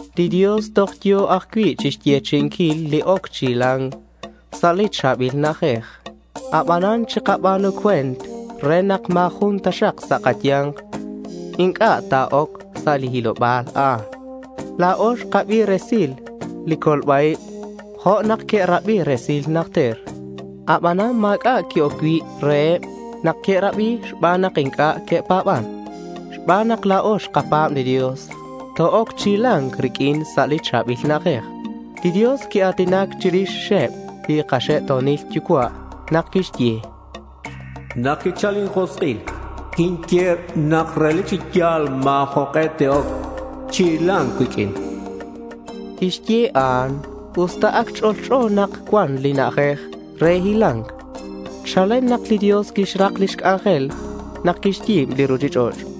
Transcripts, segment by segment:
Li Dios toj yo̱ ajcui' chixyechi'inquil li oc chi hila̱nc sa' li cha̱bil na'ajej. Abanan chikaba̱nu cue̱nt re nak ma̱ jun taxak sa' kaya̱nk inc'a' ta̱oc sa' li hiloba̱l a'an. La̱o xkabi resil li colba-ib jo' nak que'rabi resil najter. Abanan ma̱c'a' qui-oc cui' reheb nak que'rabi xban nak inc'a' que'pa̱ban. Xban nak la̱o xkapa̱b li Dios, to-oc chi hila̱nc riq'uin sa' li cha̱bil na'ajej. Li Dios quia̱tinac chirixeb li kaxe'to̱nil yucua' nak quixye: Nak quichal injosk'il, quinye nak relic chi ya̱l ma̱ jok'e te'oc chi hila̱nc cuiq'uin. Quixye a'an us ta ac ch'olch'o nak cuan li na'ajej re hila̱nc chalen nak li Dios quixrak lix c'anjel nak quixyi̱b li ruchich'och'.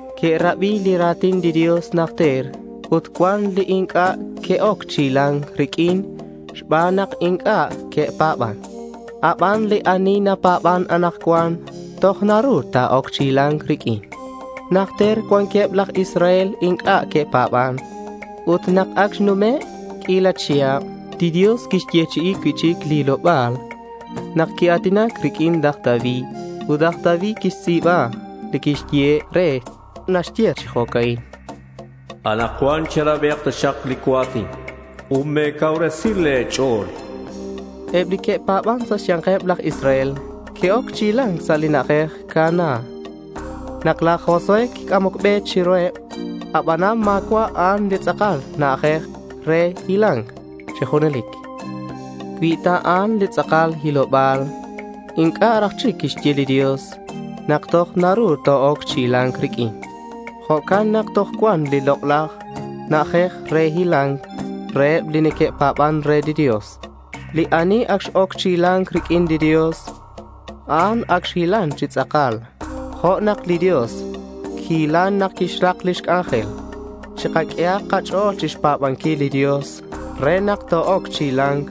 Que'rabi li ra̱tin li Dios najter ut cuan li inc'a' que'oc chi hila̱nc riq'uin xban nak inc'a' que'pa̱ban. Aban li ani napa̱ban anakcuan toj naru ta̱oc chi hila̱nc riq'uin. Najter cuanqueb laj Israel inc'a' que'pa̱ban. Ut nak ac xnume' q'uila chihab, li Dios quixyechi'i cui'chic li hiloba̱l nak quia̱tinac riq'uin laj David. Ut laj David quixtz'i̱ba li quiyehe' re li naxye chi jo'ca'in: Anakcuan cherabi taxak li cua̱tin ut me̱cacuubresi le̱ ch'o̱l, chan. Eb li que'pa̱ban sa' xya̱nkeb laj Israel que'oc chi hila̱nc sa' li na'ajej Canaán nak laj Josué quic'amoc be chiruheb. Abanan ma̱cua' a'an li tz'akal na'ajej re hila̱nc chi junelic. Cui ta a'an li tz'akal hiloba̱l, inc'a' raj chic quixye li Dios nak toj naru to-oc chi hila̱nc riq'uin. Jo'can nak toj cuan li lok'laj na'ajej re hila̱nc reheb li neque'pa̱ban re li Dios. Li ani ac x-oc chi hila̱nc riq'uin li Dios, a'an ac xhilan chi tz'akal, jo' nak li Dios quihilan nak quixrak lix c'anjel. Chikaq'uehak kach'o̱l chixpa̱banquil li Dios re nak to-oc chi hila̱nc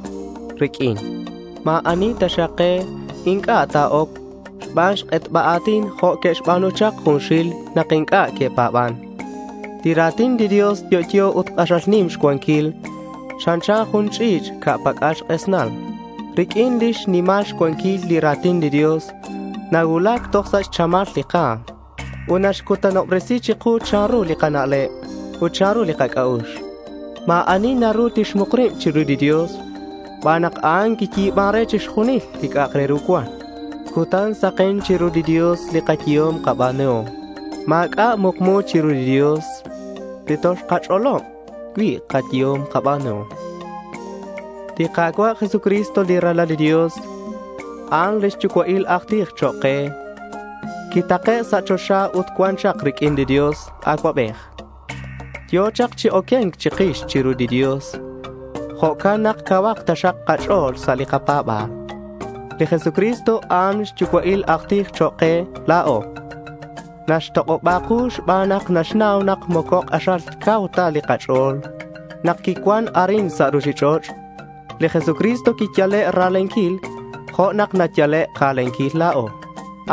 riq'uin. Ma̱ ani taxak ke inc'a' ta̱oc xban xk'etba a̱tin jo' que'xba̱nu chak junxil nak inc'a' que'pa̱ban. Li ra̱tin li Dios yo'yo ut k'axal nim xcuanquil. Chanchan jun ch'i̱ch' ca' pac'al xk'esnal. Riq'uin lix nimal xcuanquil, li ra̱tin li Dios nacuulac toj sa' xchamal li ka̱m. Ut naxc'utbesi chiku chanru li kana'leb ut chanru li kac'a'ux. Ma̱ ani naru tixmuk rib chiru li Dios xban nak a'an quiyi̱ban re chixjunil li c'a'ak re ru cuan. Cutan saken chiru li Dios li kayehom kaba̱nuhom. Ma̱c'a' mukmu chiru li Dios li toxkach'olob cui' kayehom kaba̱nuhom. Li Ka̱cua' Jesucristo, li Ralal li Dios, a'an lix yucua'il aj tij chok' ke. Quitake' sa' choxa ut cuan chak riq'uin li Dios Acuabej. Yo̱ chak chi oque̱nc chikix chiru li Dios. Jo'can nak cauhak taxak kach'o̱l sa' li kapa̱ba̱l. Li Jesucristo a'an xyucua'il aj tij chok' ke la̱o. Naxtok'oba ku xban nak naxnau nak moco k'axal cau ta li kach'o̱l. Nak quicuan arin sa' ruchich'och', li Jesucristo quiyale' ra̱lenquil jo' nak nayale' ka̱lenquil la̱o.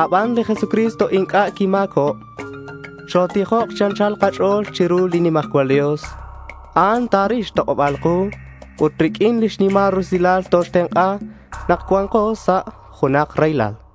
Aban li Jesucristo inc'a' quima̱cob. Chotijok chi anchal kach'o̱l chiru li nimajcual Dios. A'an ta̱ril xtok'oba̱l ku ut riq'uin xnimal rusilal toxtenk'a nak cua̱nko sa' junak raylal.